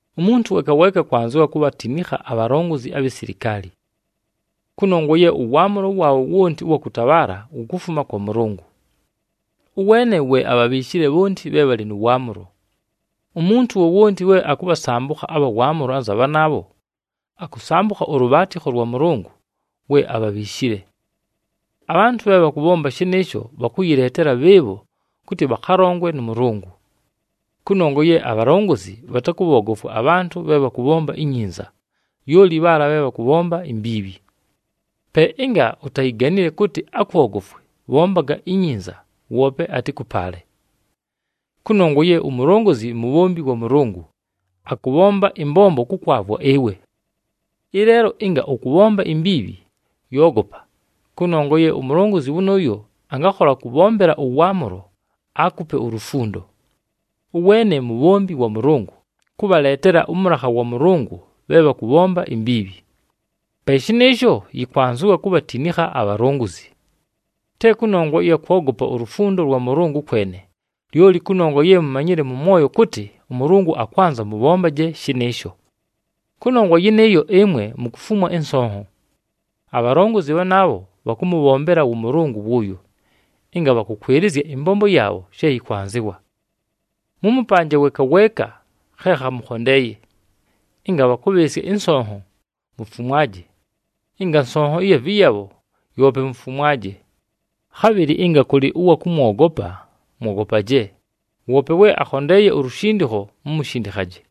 Umuntu weeka weeka akwanzɨwa kubhatinikha abhalongozi abhi silikaali. Kʉnongwa ye ʉwaamʉlo waabho wonti ʉwa kʉtabhaala wukufuma kwa Mʉlʉngʉ. Ʉweene we abhabhiishile bhonti bhe bhalɨ nʉ waamʉlo. Umuntu wowonti we akʉbhasambʉkha abha waamʉlo anza bhanaabho, akʉsambʉkha ʉlʉbhaatɨkho lwa Mʉlʉngʉ we abhabhiishile. Abhantʉ bhe bhakʉbhomba shɨnɨɨsho bhakʉyɨleetela bhɨɨbho kʉtɨ bhakhalongwe nʉ Mʉlʉngʉ. Kʉnongwa ye abhalongozi bhatakʉbhoogofwa abhantʉ bhe bhakʉbhomba inyinza, lyoli bhaala bhe bhakʉbhomba imbiibhi. Pe ɨnga utayiganile kʉtɨ akwogofwe, bhombaga inyinza, woope atɨkʉpaale. Kʉnongwa ye umulongozi mubhombi wa Mʉlʉngʉ, akʉbhomba ɨmbombo kʉkwavwa ɨwe. Ɨleelo, ɨnga ʉkʉbhomba imbiibhi, yoogopa! Kʉnongwa ye umulongozi wʉnʉʉyo angakhola kʉbhombela ʉwaamʉlo, aakupe ulufundo. Ʉweene mubhombi wa Mʉlʉngʉ, kʉbhaleetela ʉmʉlakha wa Mʉlʉngʉ bhe bhakʉbhomba imbiibhi. Pe shɨnɨɨsho, yɨkwanzɨwa kubhatinikha abhalongozi. Te kʉnongwa ɨya kwogopa ulufundo lwa Mʉlʉngʉ kwene, lyoli kʉnongwa ye mumanyile mʉ mwoyo kʉtɨ ʉMʉlʉngʉ akwanza mʉbhombaje shɨnɨɨsho. Kʉnongwa yɨnɨɨyo, ɨmwe mukufumwa ɨnsonho. Abhalongozi bhanaabho bhakʉmʉbhombela wʉ Mʉlʉngʉ wʉʉyo, ɨnga bhakʉkwɨlɨzya ɨmbombo yaabho she yɨkwanzɨwa. Mʉmʉpanje weeka weeka khe khamʉkhondeeye. Ɨnga bhakʉbhɨɨsya ɨnsonho, mufumwaje, ɨnga nsonho ɨya vɨyabho, yoope mufumwaje. Khabhɨlɨ ɨnga kʉlɨ ʉwa kʉmwogopa, mwogopaje, woope we akhondeeye ulushindikho, mumushindikhaje.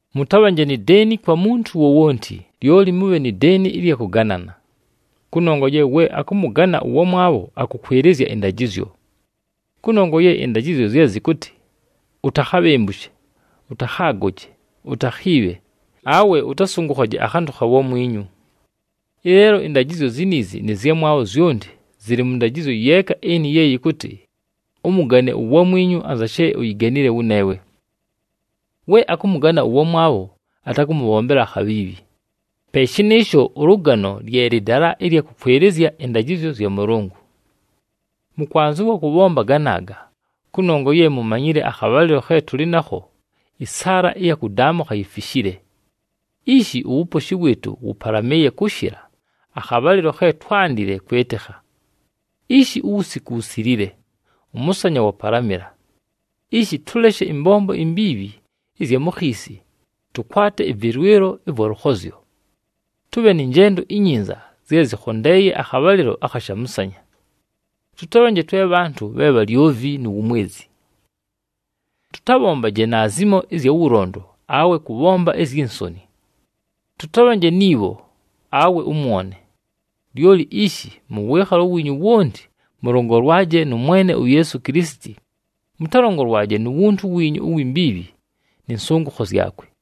Mʉtabhanje ni deeni kwa muntu wowonti, lyoli mʉbhe ni deeni ɨlya kʉganana. Kʉnongwa ye we akʉmʉgana ʉwamwabho akʉkwɨlɨzya ɨndajɨzyo. Kʉnongwa ye ɨndajɨzyo zye zɨkʉtɨ, “Utakhabhembushe, ʉtakhaagoje, utakhiibhe, awe ʉtasʉngʉkhaje akhantʉ kha wamwinyu.” Ɨleelo ɨndajɨzyo ziniizi nɨ zyamwabho zyonti zɨlɨ mʉ ndajɨzyo yeeka ɨnɨ ye yɨkʉtɨ, “Ʉmʉgane uwamwinyu anza she uyiganile wʉneewe.” We akʉmʉgana ʉwamwabho, atakʉmʉbhombela akhabhiibhi. Pe shɨnɨɨsho, ʉlʉgano lye lɨdala ɨlya kʉkwɨlɨzya ɨndajɨzyo zya Mʉlʉngʉ. Mʉkwanzɨwa kʉbhomba ganaaga, kʉnongwa ye mumanyile akhabhalɨlo khe tʉlɨ nakho, ɨsaala ɨya kʉdaamʉkha yifishile. Ishi uwuposhi wɨɨtʉ wʉpalamɨɨye kʉshɨla akhabhalɨlo khe twándile kwɨtɨkha. Ishi uwusiku wusililile, ʉmʉsanya wapalamɨla. Ishi, tʉleshe ɨmbombo imbiibhi ɨzya mu khiisi, tʉkwate ɨvɨlwɨlo ɨvwa lʉkhozyo. Tʉbhe nɨ njendo inyinza zye zɨkhondeeye akhabhalɨlo akha shamʉsanya. Tʉtabhanje twe bhantʉ bhe bhalyovi nu wumwezi. Tʉtabhombaje naazimo ɨzya wʉlondo awe kʉbhomba izyi nsoni. Tʉtabhanje ni bho awe ʉmwone. Lyoli ishi, mʉ wɨɨkhalo wiinyu wonti, mʉlongolwaje nʉ Mwene uYeesu Kilisiti, mʉtalongolwaje nu wuntu wiinyu uwi mbiibhi, nɨ nsʉngʉkho zyakwe.